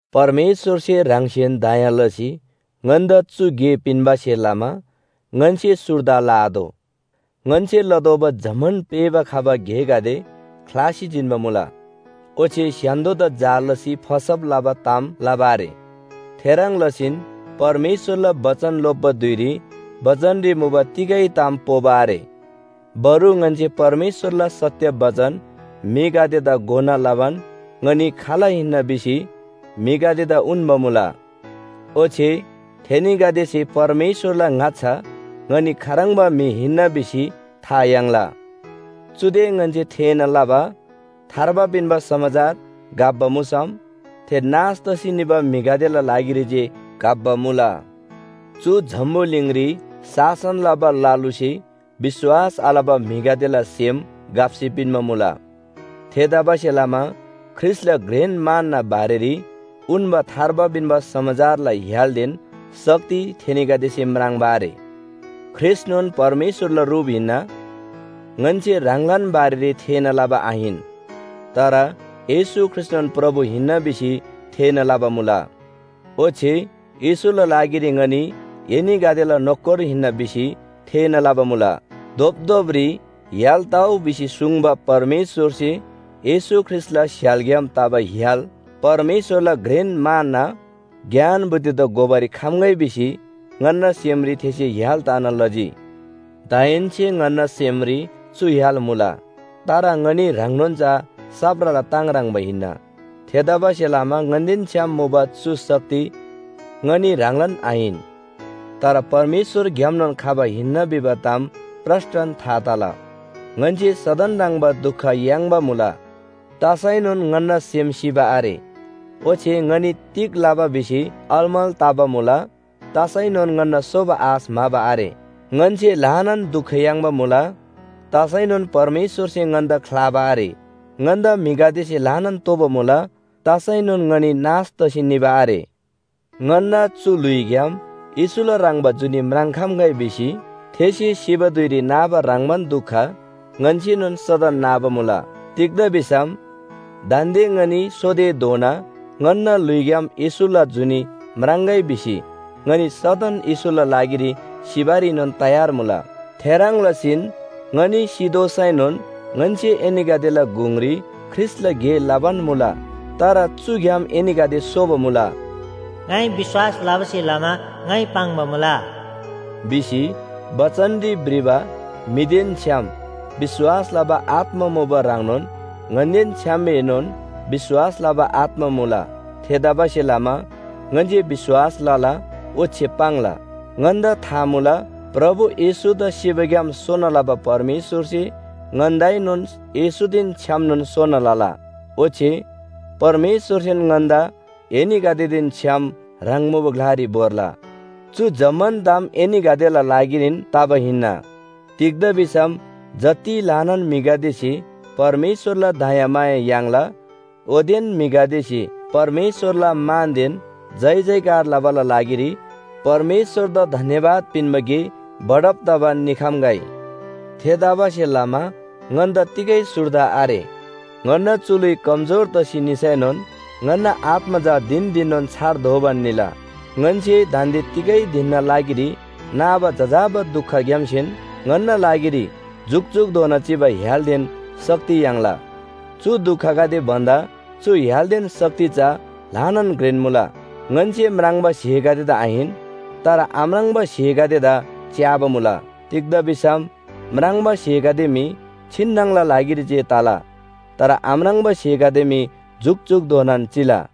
परमेश्‍वरसे ह्राङसेन दया लसी ङन्‍दा चु गे पिन्‍बासे लमा ङन्‍से सुर्दा लआतोः। ङन्‍से लतोःबा जम्‍मान पेःबा खबा गेगदे ख्‍लासी जिन्‍बा मुला। ओच्‍छे स्‍य्‍हान्‍दोदा जाल लसी फसब लबा ताम लबा आरे। थेह्रङ् लसीन परमेश्‍वरला बचन लोप्‍बा धुइरी बचनरी मुबा तिगै ताम पोबा आरे। बरु ङन्‍से परमेश्‍वरला सत्‍य बचन म्‍हिगदेदा घोना लबान ङनी खाल हिन्‍ना भिसी म्‍हिगदेदा उन्‍बा मुला। ओच्‍छे थेनीगदेसे परमेश्‍वरला ङाच्‍छा ङनी खाह्रङ्बा म्‍हि हिन्‍ना भिसी था याङ्ला। चुदे ङन्‍से थेःना लबा थार्बा पिन्‍बा समाचार घप्‍बा मुसम थे नाश तसी निबा म्‍हिगदेला लागिरी जे घप्‍बा मुला। चु जम्‍बुलिङरी शासन लबा ल लुसे विश्‍वास आलबा म्‍हिगदेला सेम घप्‍सी पिन्‍बा मुला। थेतबासेलमा ख्रीष्‍टला घ्रेन मानना बारेरी उन्‍बा थार्बा पिन्‍बा समाचारला य्‍हालदेन शक्ति थेनीगदेसे म्राङ्बा आरे। ख्रीष्‍टनोन परमेश्‍वरला रुप हिन्‍ना। ङन्‍से ह्राङलान बारेरी थेःना लबा आहिन, तर येशू ख्रीष्‍टनोन प्रभु हिन्‍ना भिसी थेःना लबा मुला। ओच्‍छे येशूला लागिरी ङनी एनीगदेला नोकर हिन्‍ना भिसी थेःना लबा मुला। “धोपधोपरी य्‍हाल तउ” भिसी सुङ्बा परमेश्‍वरसे येशू ख्रीष्‍टला स्‍य्‍हालग्‍याम तबा य्‍हाल परमेश्‍वरला घ्रेन मानना ज्ञान बुद्धिदा घोबारी खम्‍गै भिसी ङन्‍ना सेमरी थेसे य्‍हाल तना लजी। दाहेन्‍से ङन्‍ना सेमरी चु य्‍हाल मुला, तर ङनी ह्राङनोन चा साप्राला ताङ ह्रङ्‌बा हिन्‍ना। थेतबासेलमा ङन्‍देन छ्‌याम मुबा चु शक्ति ङनी ह्राङलान आहिन, तर परमेश्‍वरग्‍यामनोन खबा हिन्‍ना भिबा ताम प्रस्‍टन था तला। ङन्‍से सदन ह्रङ्‌बा दुख याङ्बा मुला, तसैनोन ङन्‍ना सेम सिबा आरे। ओच्‍छे ङनी तिग लबा भिसी अलमल तबा मुला, तसैनोन ङन्‍ना सोबा आश म्‍हाबा आरे। ङन्‍से ल्‍हानान दुख याङ्बा मुला, तसैनोन परमेश्‍वरसे ङन्‍दा ख्‍लाबा आरे। ङन्‍दा म्‍हिगदेसे ल्‍हानान तोबा मुला, तसैनोन ङनी नाश तसी निबा आरे। ङन्‍ना चु ल्‍हुइग्‍याम येशूला ह्रङ्‌बा जुनी म्राङ्‌खम्‍गै भिसी थेसे सिबा धुइरी नाबा ह्रङ्‌बान दुख ङन्‍सेनोन सदन नाबा मुला। तिग्‍दा भिसम दान्‍दे ङनी सोतेधोना ङन्‍ना ल्‍हुइग्‍याम येशूला जुनी म्राङ्‍गै भिसी ङनी सदन येशूला लागिरी सिबारीनोन तयार मुला। थेह्रङ् लसीन ङनी सितोःसैनोन ङन्‍से एनीगदेला गुङरी ख्रीष्‍टला गे लबान मुला, तर चुग्‍याम एनीगदे सोबा मुला। “ङाइ विश्‍वास लबासे लमा ङाइ पाङ्बा मुला” भिसी बचनरी भ्रिबा म्‍हिदेन छ्‌याम विश्‍वास लबा आत्‍मा मुबा ह्रङ्नोन ङन्‍देन छ्‌यामएनोन विश्‍वास लबा आत्‍मा मुला। थेतबासेलमा ङन्‍से विश्‍वास लला ओच्‍छे पाङ्ला। ङन्‍दा था मुला, प्रभु येशूदा सिबाग्‍याम सोना लबा परमेश्‍वरसे ङन्‍दाएनोन येशूदेन छ्‌यामनोन सोना लला, ओच्‍छे परमेश्‍वरसेन ङन्‍दा एनीगदेदेन छ्‌याम ह्राङ मुबा ग्‍लारी भोर्ला। चु जम्‍मान ताम एनीगदेला लागिरीन तबा हिन्‍ना। तिग्‍दा भिसम जति ल्‍हानान म्‍हिगदेसे परमेश्‍वरला दयामाया याङ्ला ओतेन म्‍हिगदेसे परमेश्‍वरला मानदेन जयजयकार लबाला लागिरी परमेश्‍वरदा धन्‍यवाद पिन्‍बा गे बढब तबान निखम्‍गै। थेतबासेलमा ङन्‍दा तिगै सुर्दा आरे। ङन्‍ना चु ल्‍हुइ कमजोर तसी निसैनोन ङन्‍ना आत्‍मा चा धिन धिननोन छार दोबान निला। ङन्‍से दान्‍दे तिगै धिनना लागिरी नाबा जजाबा दुखग्‍यामसेन ङन्‍ना लागिरी जुकजुकधोना चिबा य्‍हालदेन शक्ति याङ्ला। चु दुखगदे भन्‍दा चु य्‍हालदेन शक्ति चा ल्‍हानान घ्रेन मुला। ङन्‍से म्राङ्बा स्‍हेगदेदा आहिन, तर आम्राङ्बा स्‍हेगदेदा च्‍याबा मुला। तिग्‍दा भिसम म्राङ्बा स्‍हेगदे मी छिन्‍नङला लागिरी जे तला, तर आम्राङ्बा स्‍हेगदे मी जुकजुकधोनान चिला।